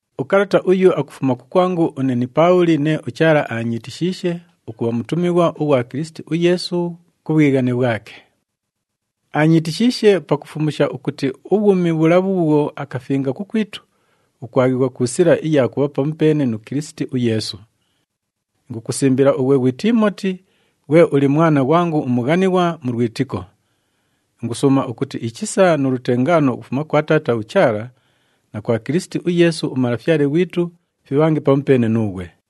Ukalata uyu akufuma kukwangu une ni Paabhuli nee uChaala aanyiitishiishe ukubha mutumighwa ughwa Kilisiti uYeesu ku bhwighane bhwake. Aanyiitishiishe pakufumusha ukuti ubhwumi bhula bhuubhwo akafinga kukwitu, bhukwaghighwa ku sila iya kubha pamupeene nu Kilisiti uYeesu. Ingukusimbila ughwe ghwi Tiimoti ghwe uli mwana ghwangu umughanighwa mu lwitiko. Ingusuuma ukuti ichisa nu lutengaano ukufuma kwa Taata uChaala na kwa Kilisiti uYeesu uMalafyale ghwitu fibhange pamupeene nuughwe.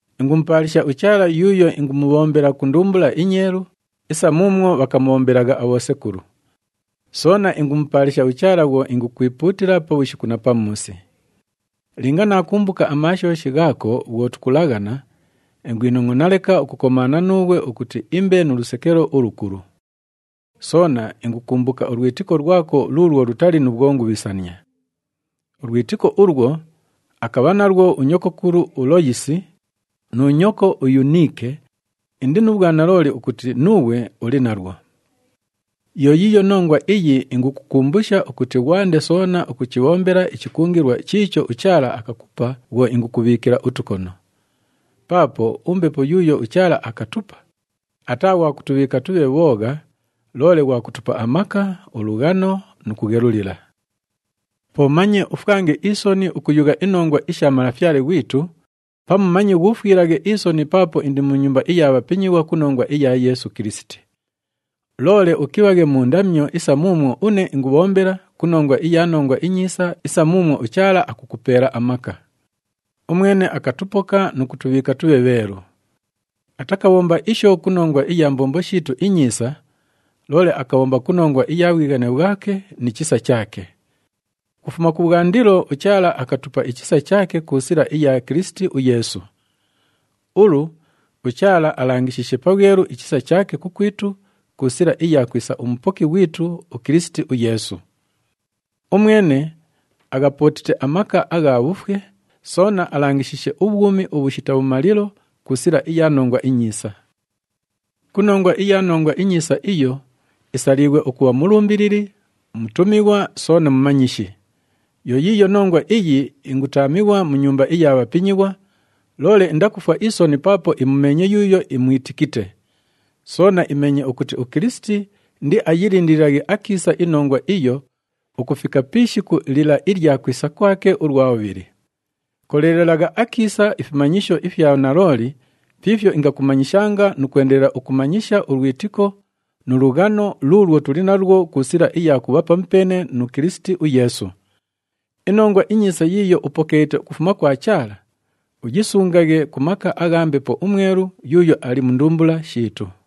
Ingumupaalisha uChaala yuuyo ingumubhombela ku ndumbula inyeelu isa muumwo bhakamubhombelagha abhosekulu. Soona ingumupaalisha uChaala bhwo ingukwipuutila pabhushiku na pamuusi. Linga naakumbuka amaashooshi ghaako bhwo tukulaghana, ingwinongʼona leka ukukomaana nuughwe ukuti imbe nu lusekelo ulukulu. Soona ingukumbuka ulwitiko lwako luulwo lutali nu bhwongubhisania. Ulwitiko ulwo, akabha nalwo unyokokulu uLoyisi nu nyoko uYuniike, indi nu bhwanalooli ukuti nuughwe uli nalwo. Yo yiiyo nongwa iyi ingukukumbusha ukuti ghwande soona ukuchibhombela ichikungilwa chiicho uChaala akakupa bhwo ingukubhiikila utukono. Paapo uMbepo yuuyo uChaala akatupa, ataa ghwa kutubhiika tubhe bhoogha, loole ghwa kutupa amaka, ulughano nu kughelulila. Po manye ufwange isoni ukuyugha inongwa isha Malafyale ghwitu, pamu manye ghuufwilaghe isoni paapo indi mu nyumba iya bhapinyighwa ku nongwa iya Yeesu Kilisiti. Loole ukibhaghe mu ndamyo isa muumwo une ingubhombela ku nongwa iya Nongwa iNyiisa isa muumwo uChaala akukupeela amaka. Umwene akatupoka nu kutubhiika tubhe bheelu. Atakabhomba isho ku nongwa iya mbombo shiitu inyiisa, loole akabhomba ku nongwa iya bhwighane bhwake ni chisa chaake. Ukufuma kubhwandilo, uChaala akatupa ichisa chaake ku sila iya Kilisiti uYeesu. Ulu, uChaala alangishiishe pabhwelu ichisa chaake kukwitu ku sila iya kwisa uMupoki ghwitu uKilisiti uYeesu. Umwene aghapootite amaka agha bhufwe, soona alangishiishe ubhwumi ubhushita bhumalilo ku sila iya Nongwa iNyiisa. Ku nongwa iya Nongwa iNyiisa iyo, isaliighwe ukubha mulumbilili, mutumighwa soona mumanyishi. Yo yiiyo nongwa iyi ingutaamighwa mu nyumba iya bhapinyighwa, loole indakufwa isoni paapo imumeenye yuuyo imwitikite. Soona imeenye ukuti uKilisiti indiayilindililaghe akiisa iNongwa iyo ukufika pi ishiku lila ilya kwisa kwake ulwa bhubhili. Koleelelagha akiisa ifimanyisho ifya nalooli fiifyo ingakumanyishanga nu kwendelela ukumanyisha ulwitiko nu lughano luulwo tuli nalwo ku sila iya kubha pamupeene nu Kilisiti uYeesu. INongwa iNyiisa yiiyo upokeelite ukufuma kwa Chaala, uyisungaghe ku maka agha Mbepo uMwelu yuuyo ali mu ndumbula shiitu.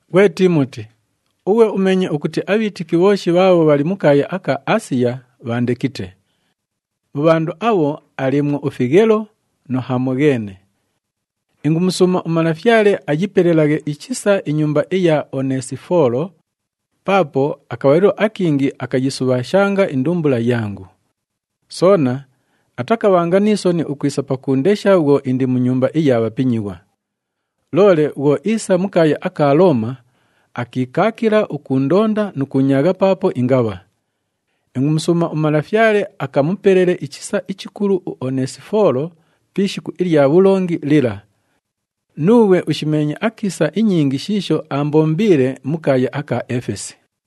Ghwe Tiimoti, ughwe umeenye ukuti abhiitiki bhooshi bhaabho bhali mu kaaya aka Aasiya bhaandekite. Mu bhandu abho aliimwo uFighelo nu Hamogheene. Ingumusuuma uMalafyale ayipelelaghe ichisa inyumba iya Oneesifoolo, paapo akabhalilo akingi akayisubhaashanga indumbula yangu. Soona atakabhanga ni soni ukwisa pakuundesha bhwo indi mu nyumba iya bhapinyighwa. Loole bhwo iisa mu kaaya aka Looma, akiikaakila ukuundonda nu kuunyaagha paapo ingabha. Ingumusuuma uMalafyale akamupelele ichisa ichikulu uOneesifoolo pi ishiku ilya bhulongi lila. Nuughwe ushimeenye akiisa inyingi shiisho aambombiile mu kaaya aka Efesi.